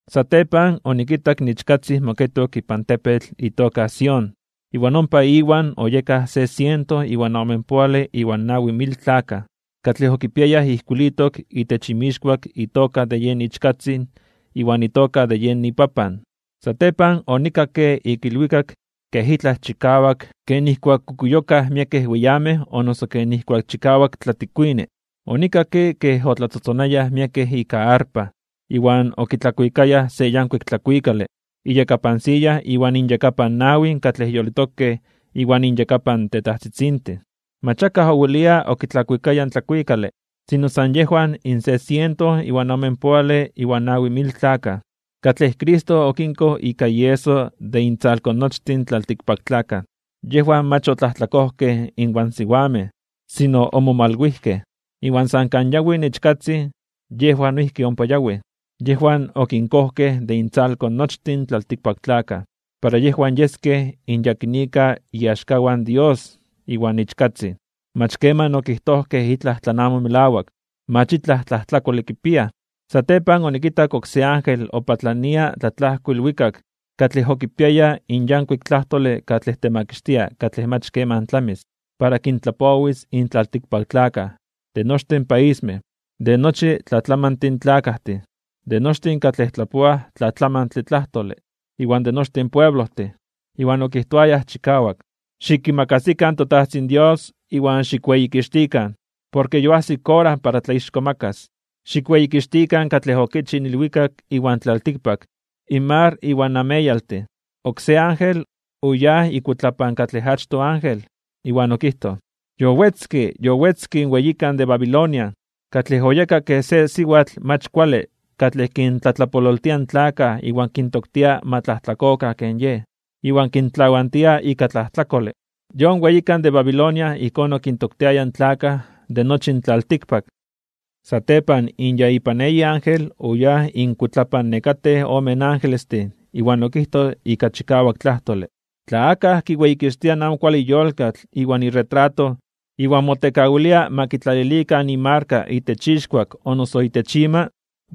Satepan onikitak in Ichkatzin moketok ipan tepetl itoka Sión. Iwan ompa Iwan oyekaj se siento iwan omenpoale iwan nawi mil tlakaj, katlej okipiayaj ijkuilitok itech inmixkuak itoka de yen Ichkatzin iwan itoka de yen iPapan. Satepan onikakke ik ilwikak kej itlaj chikawak ken nijkuak kukuyokaj miekej weyamej o noso ken nijkuak chikawak tlatikuini. Onikakke kej otlatzotzonayaj miekej ika arpa. Iwan okitlakuikayaj se yankuik tlakuikale, iyakapan siya iwan inyakapan nawin katlej yolitokej iwan inyakapan in tetajtzitzintin. Mach akaj owelia okitlakuikaya in tlakuikale, sino san yejwan in se siento iwan omenpoale iwan nawi mil tlakaj, katlej Cristo okinkoj ika ieso de intzalko nochtin in tlaltikpaktlakaj. Yejwan mach otlajtlakojkej inwan siwamej, sino omomalwijkej. Iwan san kan yawi in Ichkatzin yejwan noijki ompa yawij. Yejwan okinkojkej de intzalko nochtin in tlaltikpaktlakaj, para yejwan yeskej in yakinika iaxkawan Dios iwan Ichkatzin. Mach keman okijtojkej itlaj tlan amo melawak. Mach itlaj tlajtlakole kipiaj. Satepan onikitak oksé ángel opatlania tlatlajko ilwikak katlej okipiaya in yankuik tlajtole katlej temakixtia katlej mach keman tlamis, para kintlapowis in tlaltikpaktlakaj, de nochtin paismej, de nochi tlatlamantin tlakajtin, de nochtin katlej tlapoaj tlatlamantle tlajtole, iwan de nochtin pueblojtin. Iwan okijtoaya chikawak: ―Xikimakasikan toTajtzin Dios iwan xikweyikixtikan, porke yoajsik ora para tlaixkomakas (tlatzonmanas). Xikweyikixtikan katlej okichij in ilwikak iwan tlaltikpak, in mar iwan ameyaltin. Oksé ángel oyáj ikuitlapan katlej achtoj ángel iwan okijtoj: ―Yowetzke, yowetzke in weyikan de Babilonia, katlej oyeka kej se siwatl mach kuale katlej kintlatlapololtia in tlakaj iwan kintoktia ma tlajtlakokan ken yej, iwan kintlawantia ika tlajtlakole. Yon weyikan de Babilonia ijkón okintoktiaya in tlakaj de nochi in tlaltikpak. Satepan in ya ipan eyi ángel oyáj inkuitlapan nekatej ome angelestin iwan okijtoj ika chikawak tlajtole: ―Tla akaj kiweyikixtia in amo kuale yolkatl iwan iretrato, iwan motekawilia ma kitlalilikan imarka itech ixkuak o noso itech ima,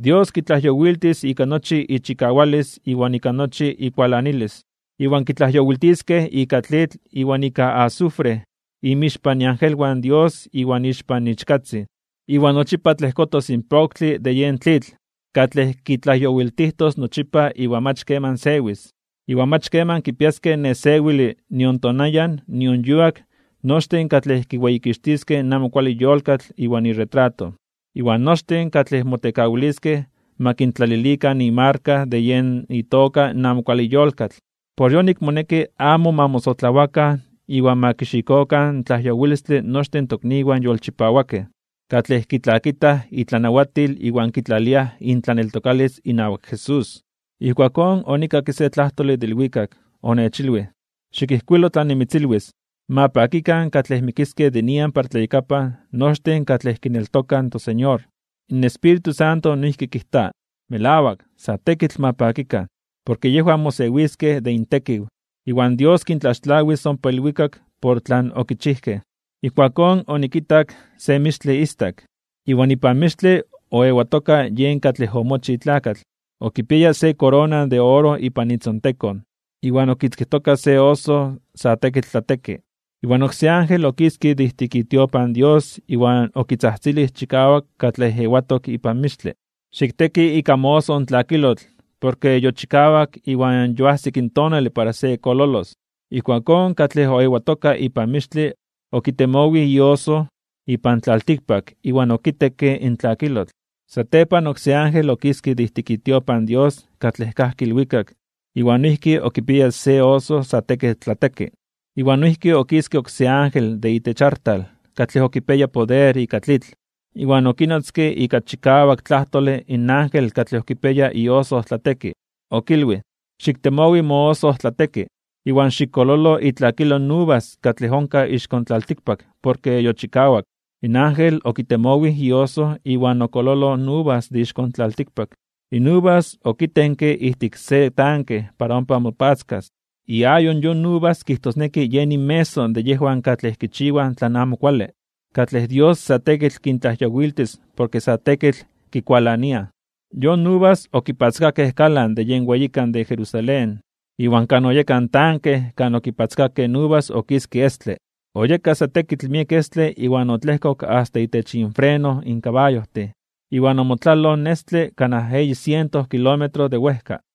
Dios kitlajyowiltis ika nochi ichikawalis iwan ika nochi ikualanilis. Iwan kitlajyowiltiskej ika tlitl iwan ika azufre inmixpan iangelwan in Dios iwan ixpan Ichkatzin. Iwan nochipa tlejkotos in poktle de yen tlitl katlej kitlajyowiltijtos nochipa iwan mach keman sewis. Iwan mach keman kipiaskej nesewile nion tonayan nion yuak nochtin katlej kiweyikixtiskej in amo kuale yolkatl iwan iretrato, iwan nochtin katlej motekawiliskej ma kintlalilikan imarka de yen itoka in amo kuale yolkatl. Por yonik moneki amo ma mosotlawakan iwan ma kixikokan in tlajyowilistle nochtin in tokniwan yolchipawakej, katlej kitlakitaj itlanawatil iwan kitlaliaj intlaneltokalis inawak Jesús. Ijkuakón onikakke se tlajtole de ilwikak. Onechilwij: ―Xikijkuilo tlan nimitzilwis: “Ma pakikan katlej mikiskej de nian para tlayakapan nochtin katlej kineltokaj in toSeñor.” In Espíritu Santo noijki kijta: “Melawak, sa tekitl ma pakikan, porke yejwan mosewiskej de intekiw, iwan Dios kintlaxtlawis ompa ilwikak por tlan okichijkej.” Ijkuakón onikitak se mixtle istak. Iwan ipan mixtle oewatoka yen katlej omochij tlakatl. Okipiaya se korona de oro ipan itzontekon iwan okikitzkijtoka se oso (ojoso) sa tekitl tlateki. Iwan oksé ángel okiske de ijtik itiopan Dios iwan okitzajtzilij chikawak katlej ewatok ipan mixtle: ―Xikteki ika mooso in tlakilotl. Porke yochikawak iwan yoajsik in tonale para se kololos. Ijkuakón katlej ewatok ipan mixtle okitemowij ioso ipan tlaltikpak iwan okitekke in tlakilotl. Satepan oksé ángel okiske de ijtik itiopan Dios katlej kajki ilwikak, iwan noijki okipiaya se oso sa tekitl tlateki. Iwan noijki okiske oksé ángel de itech artal katlej okipiaya poder ika tlitl. Iwan okinotzke ika chikawak tlajtole in ángel katlej kipia ioso tlateki. Okilwij: ―Xiktemowi mooso tlateki, iwan xikololo itlakilo in uvas katlej onkaj ixko tlaltikpak porke yochikawak. In ángel okitemowij ioso iwan okololoj in uvas de ixko tlaltikpak. In uvas okitenke ijtik se tanke para ompa mopatzkas. Iayo yon uvas kijtosneki yen inmeso de yejwan katlej kichiwaj tlan amo kuale, katlej Dios sa tekitl kintlajyowiltis porke sa tekitl kikualaniaj. Yon uvas okipatzkakej kalan de yen weyikan de Jerusalén. Iwan kan oyeka in tanke kan okipatzkakej in uvas okiske estle. Oyeka sa tekitl miek estle iwan otlejkok asta itech infreno in kabayojtin, iwan omotlaloj in estle kanaj eyi siento kilómetro de wejka.